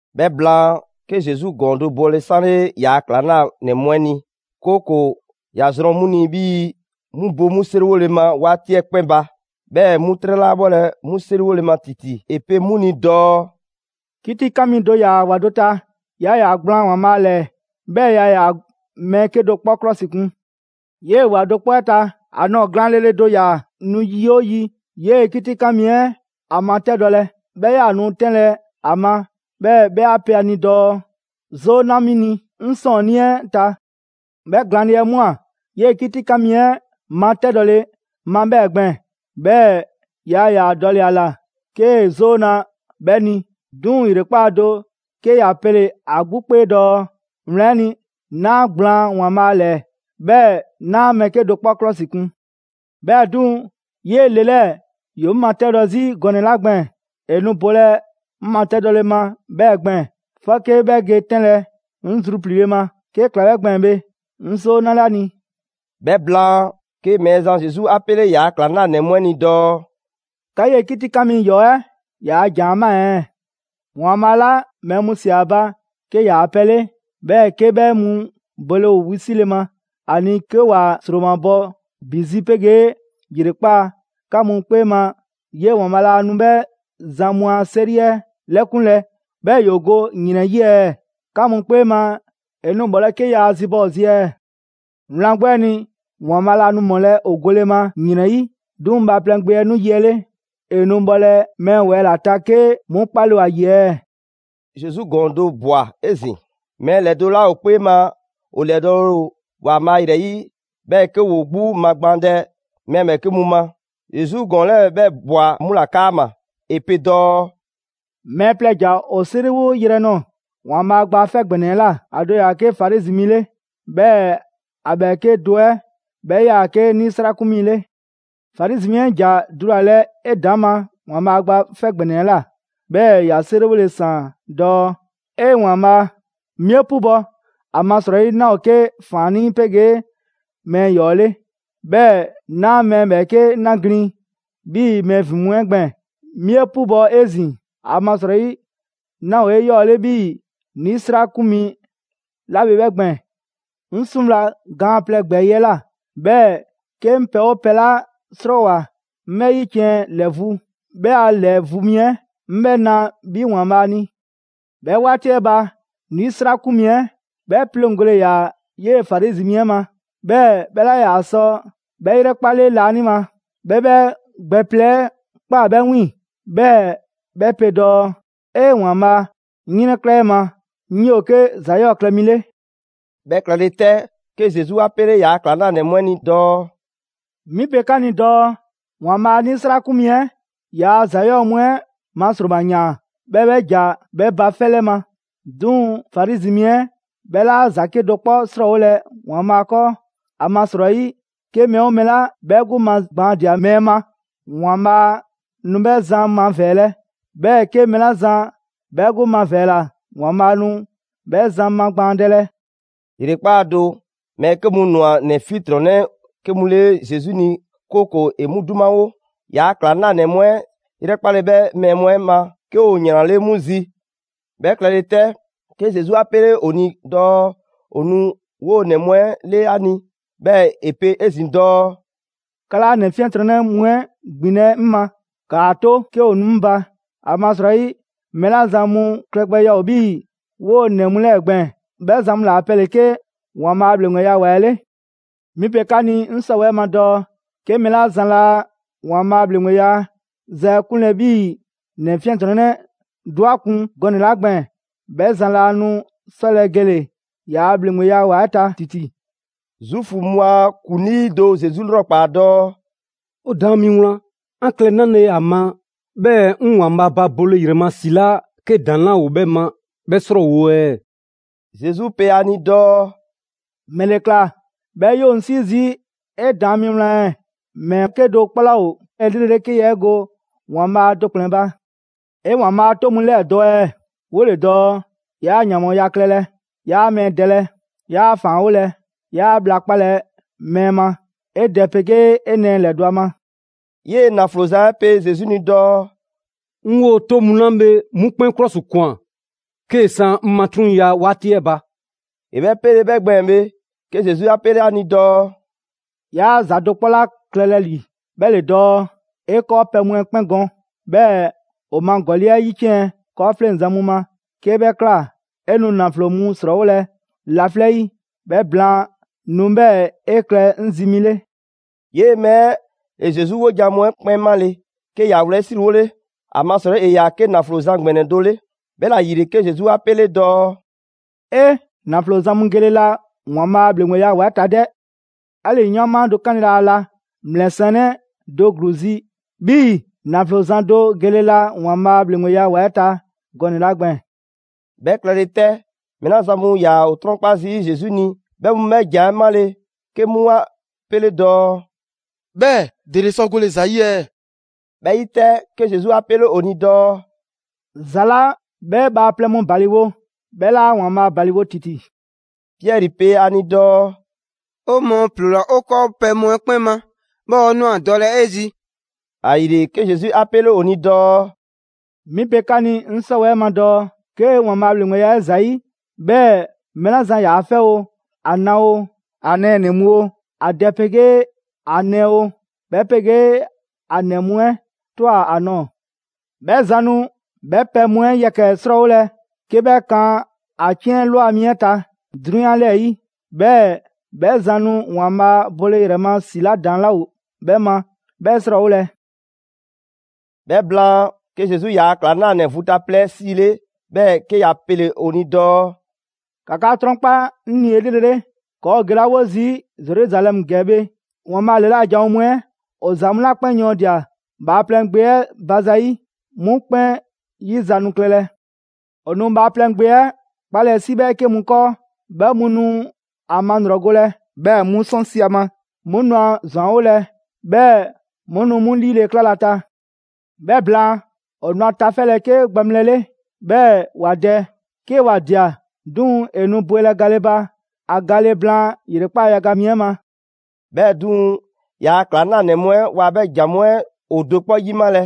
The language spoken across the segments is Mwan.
'Bhɛ blaan, 'ke Zesu ‑gɔɔn do bɔle 'sanle ‑yaa' ‑klaŋlanɛ mu 'ɛ ni, 'kooko‑ ‑ya zrɔn 'mu ni 'bhii‑ 'mu bo 'mu 'seriwole ma 'waati 'ɛ 'kpɛn ba, 'bhɛɛ‑ 'mu 'trɛ 'laa 'bhɔlɛ‑ 'mu 'seriwole ma ‑titi. ‑E pe 'mu ni dɔɔ: «'Kitikan mi do ‑yaa ‑wa do ta, yaa ‑yaa gblaan ‑Waanbhaa' ‑lɛɛ, 'bhɛɛ‑ yaa ‑yaa mɛɛ 'kedo‑ 'kpɔ 'klɔsikun. 'Yee‑ ‑wa do 'kpɔ 'ɛ ta, ‑a nɔɔ‑ glaanle le do ‑yaa nu yi 'oo yi 'yee‑ 'kitikan 'mi 'ɛ ‑a matɛdɔlɛ. 'Bhɛ 'yaa‑ nu 'tɛnlɛ‑ ‑a ma, 'bhɛɛ‑ 'bhɛ 'a pe ‑a ni dɔɔ: ‹'Zoo 'na 'mi ni 'ŋ 'sɔɔnnii 'ɛ ta!› 'Bhɛ glaanle 'ɛ ꞊mwa 'yee‑ 'kitikan mi 'ɛ matɛdɔle ma 'bhɛɛ‑ gbɛɛn‑, 'bhɛɛ‑ yaa ‑yaa dɔle‑ ‑a ‑la 'kee‑ 'zoo na 'bhɛ ni. 'Duŋ‑ ‑yrekpaa' do, 'ke ‑ya pele‑ ‑a 'gbu 'kpee dɔɔ: ‹Wlan 'ɛ ni, 'naa gblaan ‑Waanbhaa' ‑lɛɛ, 'bhɛɛ‑ 'naa mɛɛ 'kedo‑ 'kpɔ 'klɔsikun. 'Bhɛɛ‑ 'duŋ‑, 'yee‑ le 'lɛɛ‑ ‑yoo 'ŋ matɛdɔ 'zi gɔnɛ‑ 'la gbɛɛn‑, ‑e nu bolɛ 'ŋ matɛdɔle ma 'bhɛɛ‑ gbɛɛn‑, 'fɔke 'bhɛ ge 'tɛnlɛ‑ 'ŋ zrupliile ma. 'Kee‑ ꞊kla 'bhɛ gbɛɛn‑ bhe, 'ŋ 'zoo 'nale ‑a ni.›» 'Bhɛ blaan, 'ke Mɛɛzan Zesu 'a 'pele ‑yaa' ‑klaŋlanɛ mu 'ɛ ni dɔɔ: «'Ka 'yee‑ 'kitikan mi ‑yɔɔ 'ɛ ‑yaa' ‑jan 'ɛ ꞊maa ɛɛ? ‑Waanbhaa' 'la mɛɛ mu ꞊sia ‑a ba 'ke ‑yaa' pɛ 'le, 'bhɛɛ‑ 'ke 'bhɛ mu bole ‑o wisile ma ‑a ni 'ke ‑wa ‑sromabɔ ‑bi zi 'pegee ‑yrekpaa', 'ka mu 'kpee ma 'yee‑ ‑Waanbhaa' laa nu 'bhɛ zan mu a 'seri 'ɛ 'lɛkunlɛ, 'bhɛɛ‑ ‑yoo go ‑yrɛn 'yi ɛɛ? 'Ka mu 'kpee ma, ‑e nu ‑mɔlɛ' 'ke yaa zibɔ ‑o zi ɛɛ? Wlan 'gbu 'ɛ ni, ‑Waanbhaa' laa nu ‑mɔlɛ' ‑o gole ma ‑yrɛn 'yi. 'Duŋ‑ Bhaaplɛŋ Gbe 'ɛ 'nu yi 'ɛ 'le, ‑e nu bhɔlɛ mɛɛ ‑wɛɛ' ‑la ta 'ke 'mu 'kpale‑ ‑o ‑a ‑yi ɛɛ?» Zesu ‑gɔɔn do ꞊bwa 'ezin‑. Mɛɛ ‑lɛdo' 'la ‑o 'kpee ma ‑o ‑lɛdɔɔle ‑o ‑Waanbhaa' ‑yrɛ 'yi, 'bhɛɛ‑ 'ke ‑woo 'gbu magbaandɛ mɛɛ ‑bhɛɛke' mu ma, Zesu ‑gɔɔn 'lɛɛ‑ 'bhɛ ꞊bwa 'mu ‑la 'kaama‑. ‑E pe dɔɔ: «Mɛɛ plɛ ‑ja ‑o 'seriwo yrɛ nɔɔ‑ ‑Waanbhaa' Gba 'Fɛ ‑Gbɛnɛ 'ɛ ꞊la, ‑a do ‑yaa 'ke Farizi mi 'le, 'bhɛɛ‑ ‑a ‑bhɛɛke' do 'ɛ 'bhɛ 'yaa‑ 'ke 'nisrakun mi 'le. Farizi mi 'ɛ ‑ja dulalɛ 'edaŋma ‑Waanbhaa' Gba 'Fɛ ‑Gbɛnɛ 'ɛ ꞊la, 'bhɛɛ‑ ‑ya 'seriwole ‑saan dɔɔ: ‹'E, ‑Waanbhaa'! 'Mi 'e 'pubɔ‑, ‑amasrɔyi 'naa ‑o 'ke ‑faannii' 'pegee mɛɛ ‑yɔɔ' 'le, 'bhɛɛ‑ 'naa mɛɛ ‑bhɛɛke' 'na ‑glin 'bhii‑ mɛɛ ‑vin mu 'ɛ gbɛɛn‑. 'Mi 'e 'pubɔ‑ 'ezin‑, ‑amasrɔyi 'naa ‑o 'eyɔɔle 'bhii‑ 'nisrakun mi 'la bhe 'bhɛ gbɛɛn‑.› 'Ŋ 'suŋwla‑ gaan plɛ ‑gbɛɛyi' 'ɛ ꞊la, 'bhɛɛ‑ 'ke 'ŋ pɛ 'oo pɛ 'la 'srɔɔwoa꞊ 'ŋ 'bhɛ 'yiciɛn‑ ‑lɛ vu, 'bhɛɛ‑ ‑a ‑lɛ vu mi 'ɛ 'ŋ 'bhɛ na 'bhi ‑Waanbhaa' ni. 'Bhɛ 'waati 'ɛ ba, 'nisrakun mi 'ɛ 'bhɛ 'pleŋgole ‑yaa 'yee‑ Farizi mi 'ɛ ma, 'bhɛɛ‑ 'bhɛ 'laa ‑yaa sɔ 'bhɛ ‑yrɛkpale laanima. 'Bhɛ 'bhɛ gbɛ plɛ 'ɛ ꞊kpaa 'bhɛ 'wiiŋ‑, 'bhɛɛ‑ 'bhɛ pe dɔɔ: ‹'Ee, ‑Waanbhaa'! 'Ŋ 'yrɛnkla 'e ma, 'ŋ 'yoo‑ 'ke ‑za 'yɔɔ‑ klɛ mi 'le.›» 'Bhɛ klɛle 'tɛ, 'ke Zesu 'a pele ‑yaa' ‑klaŋlanɛ mu 'ɛ ni dɔɔ: «'Mi pe 'ka 'ni dɔɔ ‑Waanbhaa' 'nisrakun mi 'ɛ ‑yaa' ‑za 'yɔɔ‑ mu 'ɛ ma ‑sroma ‑yaan, 'bhɛɛ‑ 'bhɛ ‑ja 'bhɛ ba 'fɛ 'lɛ ma. 'Duŋ‑ Farizi mi 'ɛ 'bhɛ 'laa ‑za 'kedo‑ 'kpɔ 'srɔɔwolɛ ‑Waanbhaa' 'kɔɔ. ‑Amasrɔyi, 'ke mɛɛ 'oo mɛɛ 'la 'bhɛ 'gbu magbaandia mɛɛ ma, ‑Waanbhaa' nu 'bhɛ zan mavɛɛlɛ. 'Bhɛɛ‑ 'ke mɛɛ 'la zan 'bhɛ 'gbu mavɛɛla, ‑Waanbhaa' nu 'bhɛ zan magbaandɛlɛ.» ‑Yrekpaa' do, mɛɛ 'ke mu ꞊nwa ‑nɛ 'fiɛntrɔnnɛ 'ke mu 'le Zesu ni, 'kooko‑ ‑e 'mu 'dumawo. ‑Yaa' ‑klaŋlanɛ mu 'ɛ 'yrɛkpale 'bhɛ mɛɛ mu 'ɛ ma 'ke ‑o ‑yranle' 'mu zi. 'Bhɛ klɛle 'tɛ, 'ke Zesu 'a 'pele ‑o ni dɔɔ ‑o nu 'woo‑ ‑nɛ mu 'ɛ 'le ‑a ni, 'bhɛɛ‑ ‑e pe 'ezin‑ dɔɔ: «'Ka 'laa ‑nɛ 'fiɛntrɔnnɛ mu 'ɛ ‑gbinlɛ' 'ŋ ma, ‑kaa 'to 'ke ‑o nu 'ŋ ba. ‑Amasrɔyi mɛɛ 'la zan mu klɛgbɛya ‑o 'bhii‑ 'woo‑ ‑nɛ mu 'lɛɛ‑ gbɛɛn‑, 'bhɛ zan mu ‑la pɛ ‑le 'ke ‑Waanbhaa' ‑bhleŋgbeya ‑wa 'ɛ 'le. 'Mi pe 'ka ni 'ŋ 'sɔwɛɛ ma dɔɔ: 'Ke mɛɛ 'la zan laa ‑Waanbhaa' a ‑bhleŋgbeya ‑za 'ɛ 'kunlɛ‑ 'bhii‑ ‑nɛ 'fiɛntrɔnnɛ do 'a kun gɔnɛ‑ 'la gbɛɛn‑, 'bhɛ zan laa nu 'sɔlɛ‑ gele‑ ‑yaa' ‑bhleŋgbeya ‑wa 'ɛ ta ‑titi.» Zuufu mu a ‑kuŋlii do Zesu 'lrɔkpaa‑ dɔɔ: «'O Daan mi wlan, 'an klɛ 'nale‑ ‑a ma 'bhɛɛ‑ 'ŋ ‑Waanbhaa' ba bole ‑yrɛ ma ‑si 'la 'ke ‑daŋ' 'laa ‑o 'bhɛ ma 'bhɛ 'srɔɔwo‑ ɛɛ?» Zesu pe ‑a ni dɔɔ: «‑Mɛle ‑kla 'bhɛɛ‑ 'yoo‑ 'ŋ 'sii zii' 'e Daan mi wlan ɛɛ? Mɛɛ 'kedo‑ 'kpɔ 'laa ‑o 'elrele 'ke yaa 'e go ‑Waanbhaa' do ‑kplɛn ba. 'E ‑Waanbhaa' a 'toŋ mu 'lɛɛ‑ dɔ ɛɛ, 'wole‑ dɔɔ: ‹'Yaa ‑yanbhɔɔya klɛlɛ, 'yaa mɛɛ dɛlɛ, 'yaa ‑faanwolɛ, 'yaa bhla 'kpalɛ‑ mɛɛ ma, 'e dɛ 'pegee 'e nɛɛ ‑lɛdɔ' ‑a ma.›» 'Yee‑ ‑naflo zan 'ɛ pe Zesu ni dɔɔ: «'Ŋ 'woo‑ 'toŋ mu 'la bhe 'mu 'kpɛn 'klɔsikwan 'kee‑ 'san 'ŋ matruŋya 'waati 'ɛ ba.» ‑E 'bhɛ 'pele‑ 'bhɛ gbɛɛn‑ bhe, 'ke Zesu 'a 'pele 'a ni dɔɔ: «'Yaa ‑za do 'kpɔ ‑la klɛlɛ ‑li, 'bhɛ ‑le dɔɔ: 'e 'kɔɔpɛ‑ mu 'ɛ 'kpɛn gɔn, 'bhɛɛ‑ ‑o ma ‑gɔli' 'ɛ 'yiciɛn‑ 'kɔɔfleŋzan mu ma. 'Kee 'bhɛ ꞊kla, 'e nu ‑naflo mu 'srɔɔwolɛ laflɛ' 'yi. 'Bhɛ blaan, nu 'bhɛɛ‑ 'e klɛ 'ŋ zi mi 'le.» 'Yee‑ mɛɛ 'ɛ ‑e Zesu 'wojan‑ mu 'ɛ 'kpɛn 'male‑, 'ke ‑ya wlɛyisriwole, ‑amasrɔyi ‑e ‑yaa 'ke ‑naflo zan ‑gbɛnɛ do 'le. 'Bhɛla‑ ‑yile, 'ke Zesu 'a 'pele dɔɔ: «'E, ‑naflo zan mu gele la ‑Waanbhaa' a ‑bhleŋgbeya ‑wa 'ɛ ta 'dɛ! 'Ali‑ 'yɔɔnma do 'kanle‑ laa la ‑mlɛsiɛnnɛ do ‑gluu zi 'bhii‑ ‑naflo zan do gele la ‑Waanbhaa' a ‑bhleŋgbeya ‑wa 'ɛ ta gɔnɛ‑ 'la gbɛɛn‑.» 'Bhɛ klɛle 'tɛ, mɛɛ 'la zan mu ‑yaa ‑o 'trɔnkpa zii' Zesu 'ni, 'bhɛ mu 'bhɛ ‑jan 'ɛ 'male‑, 'ke 'mu 'a pele‑ dɔɔ: «'Bhɛɛ‑ ‑dele sɔ gole ‑za 'yi ɛɛ?» 'Bhɛ 'yi 'tɛ, 'ke Zesu 'a 'pele ‑o ni dɔɔ: «‑Za 'la 'bhɛ bhaaplɛŋ mu ‑baliwo, 'bhɛ 'laa ‑Waanbhaa' ‑baliwo ‑titi.» Piɛri pe ‑a ni dɔɔ: «'O mɔɔ ‑ploola 'o 'kɔɔpɛ‑ mu 'ɛ 'kpɛn ma, 'bhɛɛ‑ 'o ꞊nwa dɔlɛ 'e zi.» ‑Ayile, 'ke Zesu 'a 'pele ‑o ni dɔɔ: «'Mi pe 'ka ni 'ŋ 'sɔwɛɛ ma dɔɔ: 'ke ‑Waanbhaa' a ‑bhleŋgbeya 'ɛ ‑zayi', 'bhɛɛ‑ mɛɛ 'la zan ‑yaa 'fɛ oo, ‑a na oo, ‑a nɛɛnɛ‑ mu oo, ‑a dɛ 'pegee ‑a nɛɛ oo, 'bhɛ 'pegee ‑a ‑nɛ mu 'ɛ ꞊twa ‑a nɔɔ‑. 'Bhɛ zan nu 'bhɛ pɛ mu 'ɛ yɛkɛ‑ 'srɔɔwolɛ 'ke bhɛ kan ‑a 'ciɛn ‑lwa mu 'ɛ ta 'drunyan 'lɛɛ‑ 'yi, 'bhɛɛ‑ 'bhɛ zan nu ‑Waanbhaa' ba bole ‑yrɛ ma ‑si 'la ‑daŋ' 'laa ‑o 'bhɛ ma 'bhɛ 'srɔɔwolɛ.» 'Bhɛ blaan, 'ke Zesu ‑yaa' ‑klaŋlanɛ vu ta plɛ 'ɛ 'siile, 'bhɛɛ‑ 'ke ‑ya pele‑ ‑o ni dɔɔ: «‑Ka 'ka 'trɔnkpa 'ŋ ni 'elrele, ‑kɔɔ' ‑o gelawo zii' Zeruzalɛmu ‑gɛ bhe, ‑Waanbhaa' ‑lɛla' janwo mu 'ɛ ‑o ‑za mu 'la 'kpɛn yɔɔndia‑ Bhaaplɛŋ Gbe 'ɛ ba za 'yi 'mu 'kpɛn 'yi za nu klɛlɛ. ‑O nu Bhaaplɛŋ Gbe 'ɛ 'kpalɛ‑ 'si 'bhɛɛke mu 'kɔɔ, 'bhɛ mu 'nu ‑a malrɔgolɛ, 'bhɛɛ‑ 'mu 'sɔnsi‑ ‑a ma; 'mu nu a ‑zwanwolɛ, 'bhɛɛ‑ 'mu nu 'mu 'liile‑ 'klalɛ‑ ‑a ta. 'Bhɛ blaan, ‑o nu ‑a tafɛlɛ 'ke gbaŋbhlɛ 'le, 'bhɛɛ‑ ‑wa dɛ. 'Ke ‑wa ꞊dia, 'duŋ‑ ‑e nu bwelɛ gale ba ‑a gale blaan ‑yrekpaa' yaga mi 'ɛ ma.» 'Bhɛɛ‑ 'duŋ‑ ‑yaa' ‑klaŋlanɛ mu 'ɛ waa 'bhɛ ‑jan mu 'ɛ ‑o do 'kpɔ 'yimalɛ.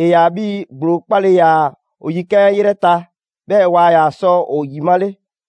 ‑E ‑yaa 'bhii‑ ‑gblo 'kpale‑ ‑yaa' ‑o yikan' 'ɛ 'yrɛ ta, 'bhɛɛ‑ waa ‑yaa sɔ ‑o ‑yimale.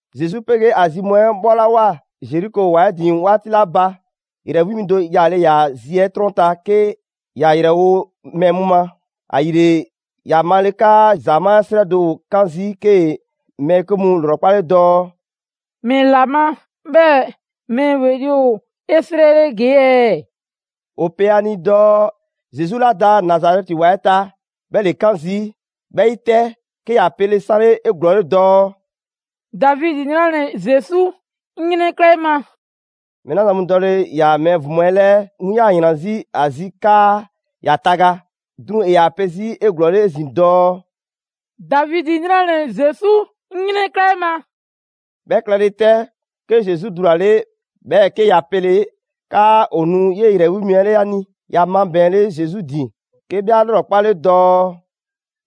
Zesu 'pegee ‑a zi mu 'ɛ 'bhɔlawoa Zeriko ‑wa 'ɛ ‑din 'waati 'la ba, ‑yrɛ 'wi mi do yaale ‑yaa zi 'ɛ 'trɔn ta 'ke ‑ya ‑yrɛwo' mɛɛ mu ma. ‑Ayile, ‑ya male 'kaa ‑zamaa' 'srɛ do ‑o 'kan zii', 'kee‑ mɛɛ 'ke mu ‑lrɔkpale dɔɔ: «‑Mɛla ma 'bhɛɛ‑ mɛɛ ‑weli' ‑o 'esrɛle ‑gee' ɛɛ?» ‑O pe ‑a ni dɔɔ Zesu 'la da Nazarɛti ‑wa 'ɛ ta, 'bhɛ ‑le 'kan zii'. 'Bhɛ 'yi 'tɛ, 'ke ‑ya pele 'sanle 'eglɔɔle dɔɔ: «Davidi 'nranɛ‑ Zesu, 'ŋ 'yrɛnkla 'e ma!» Mɛɛ 'la zan mu dɔle‑ ‑yaa mɛɛ ‑vin mu 'ɛ 'lɛɛ, 'mu 'yaa‑ ‑yran 'zi ‑a zi 'kaa ‑ya taga. 'Duŋ‑ ‑e ‑yaa pe 'zi 'eglɔɔle 'ezin‑ dɔɔ: «Davidi 'nranɛ‑ Zesu, 'ŋ 'yrɛnkla 'e ma!» 'Bhɛ klɛle 'tɛ, 'ke Zesu dulale, 'bhɛɛ‑ 'ke ‑ya pele‑ 'kaa ‑o nu 'yee‑ ‑yrɛ 'wi mi 'ɛ 'le ‑a ni. ‑Ya mabɛɛnle Zesu ‑din, 'ke 'bhɛ 'a 'lrɔkpale dɔɔ: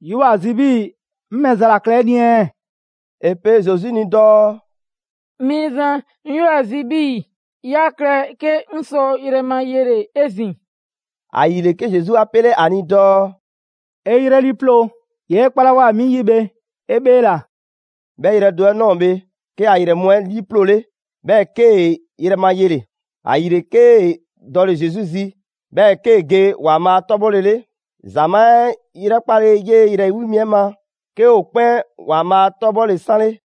«'Yoo‑ ‑a zi 'bhii‑ 'ŋ ‑mɛ za ‑la klɛ 'e ni ɛɛ?» ‑E pe Zesu ni dɔɔ: «Mɛɛzan, 'ŋ 'yoo‑ ‑a zi 'bhii‑ 'ya klɛ 'ke 'ŋ sɔ yrɛ ma yele‑ 'ezin‑.» ‑Ayile, 'ke Zesu 'a 'pele ‑a ni dɔɔ: «'E 'yrɛ 'liiploo‑! 'Yee 'kpalawoa 'mi 'yi bhe 'e 'bheela‑.» 'Bhɛ yrɛ do 'ɛ ꞊nɔɔ bhe, 'ke ‑a ‑yrɛ mu 'ɛ 'liiploole, 'bhɛɛ‑ 'kee‑ yrɛ ma yele‑. ‑Ayile 'kee‑ dɔle‑ Zesu zi, 'bhɛɛ‑ 'kee‑ ge ‑Waanbhaa' 'tɔbhɔlele. ‑Zamaa' 'ɛ 'yrɛkpale 'yee‑ ‑yrɛ 'wi mi 'ɛ ma, 'ke ‑o 'kpɛn ‑Waanbhaa' 'tɔbhɔle 'sanle.